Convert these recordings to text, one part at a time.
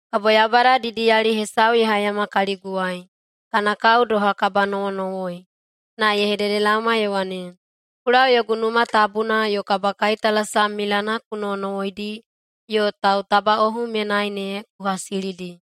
Kabo Yaubada didiyali hesau ye haiyama kaliguwai, kana kao doha kabanowonowoi, na ye hededelaoma ye wane, “Ku lau yogu Numa Tabuna yo kabakaitalasam milana ku nowonowoidi yo tautabaꞌohu menai ne ku hasilidi.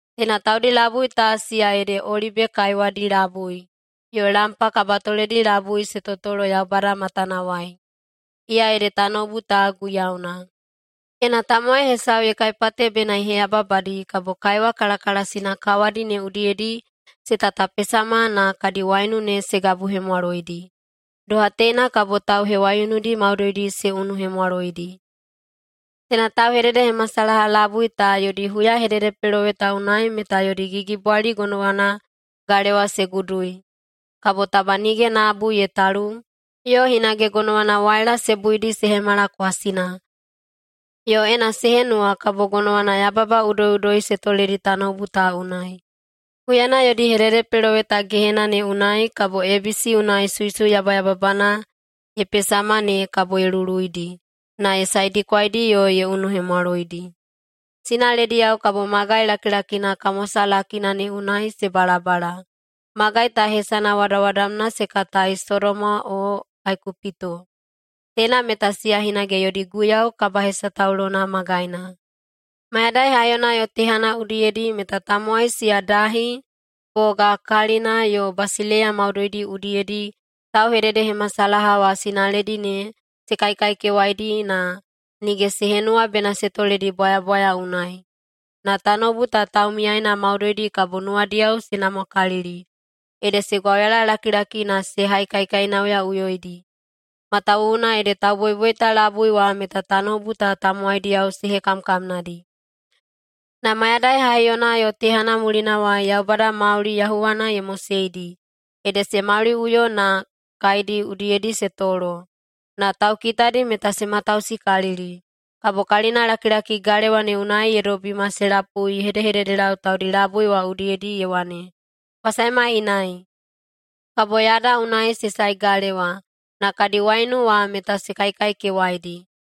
Teina taudi labui ta siya ede olibe kaiwadi labui yo lampa kabatoledi labui se totolo Yaubada matanawai, iya ede tanoubu ta Guiyauna. Ena tamowai hesau ye kaipate bena ye heyababadi kabo kaiwa kalakalasina kawadi ne udiyedi se tatapesama na kadi waiunu ne se gabuhemwaloidi. Doha teina kabo tauhewaiunudi maudoidi se unuhemwaloidi. Teina tauhededehemasalaha labui ta yodi huyahededepeloweta unai meta yodi gigibwali gonowana galewa se gudui, kabo taba nige nabu ye talu, yo hinage gonowana waila se buidi se hemala kwasina, yo ena se henuwa kabo gonowana yababa udoiꞌudoi se toledi tanoubu ta unai. Huyana yodi hededepeloweta gehena ne unai kabo ebisi unai suisui yabayababana ye pesama ne kabo ye luluidi, na ye saedikwaidi yo ye unuhemwaloidi. Sinalediyao kabo magai lakilakina kamwasalakina ne unai se balabala. Magai ta hesana wadawadamna se katai Sodoma o Aikupito. Teina meta siya hinage yodi Guiyau kabahesataulona magaina. Mayadai haiyona yo tehana udiyedi meta tamowai siya dahi, boga, kalina, yo basileiya maudoidi udiyedi, tauhededehemasalaha wa sinaledi ne se kaikaikewaidi na nige se henuwa bena se toledi bwayabwaya unai. Na tanoubu ta taumiyaena maudoidi kabo nuwadiyao se namwakalili, ede se gwauyalalakilaki na se haikaikainauyaꞌuyoidi. Matawuwuna ede tauboiboita labui wa meta tanoubu ta tamowaidiyao se hekamkamnadi. Na mayadai haiyona yo tehana mulinawai Yaubada mauli yahuwana ye moseidi, ede se mauliꞌuyo na kaedi udiyedi se tolo, na taukitadi meta se matausikalili. Kabo kalinalakilaki galewa ne unai ye dobima se lapui ye hedehededelau taudi labui wa udiyedi ye wane, “Kwa saema inai.” Kabo yada unai se sae galewa, na kadi waiunu wa meta se kaikaikewaidi.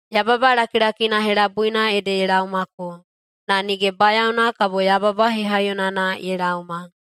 Yababa lakilakina helabuina ede ye laomako, na nige bayaona kabo yababa hehaiyonana ye laoma.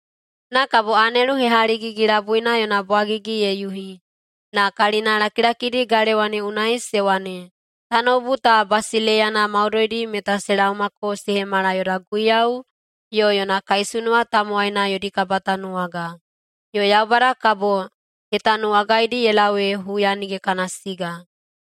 Na kabo anelu hehaligigi-labuina yona bwagigi ye yuhi, na kalina lakilakidi galewa ne unai se wane, “Tanoubu ta basileiyana maudoidi meta se laomako se hemala yoda Guiyau yo yona kaisunuwa tamowaina yodi kabatanuwaga. Yo Yaubada kabo ye tanuwagaidi ye lau ee huya nige kana siga.”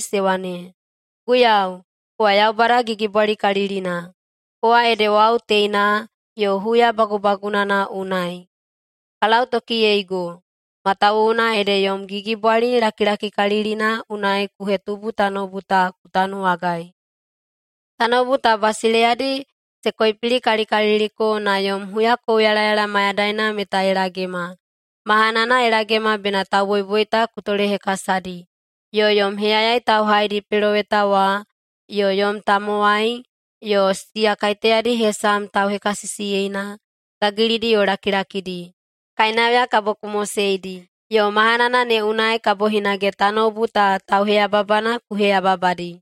se wane, “Guiyau, kowa Yaubada Gigibwalikalilina. Kowa ede wau teina yo huya bagubagunana unai. Ka lautokiyeigo, matawuwuna ede yom gigibwali lakilakikalilina unai ku hetubu tanoubu ta ku tanuwagai. Tanoubu ta basileiyadi se koipilikalikaliliko, na yom huyakouyalayala mayadaina meta ye lagema. Mahanana ye lagema bena tauboiboita ku tolehekasadi, yo yom heyayai tauhaidi peloweta wa, yo yom tamowai, yo siya kaiteyadi hesam tauhekasisiyeina, gagilidi yo lakilakidi, kainauya kabo ku moseidi. Yo mahanana ne unai kabo hinage tanoubu ta tauheyababana ku heyababadi.”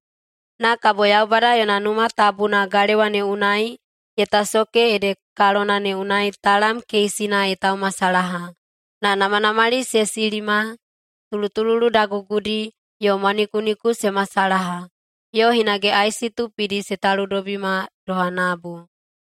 Na kabo Yaubada yona Numa Tabuna galewa ne unai ye tasoke ede kalona ne unai talam keisina ye taumasalaha. Na namanamali se silima, tulutululu dagugudi, yo mwanikuniku se masalaha, yo hinage aisi tupidi se taludobima doha nabu.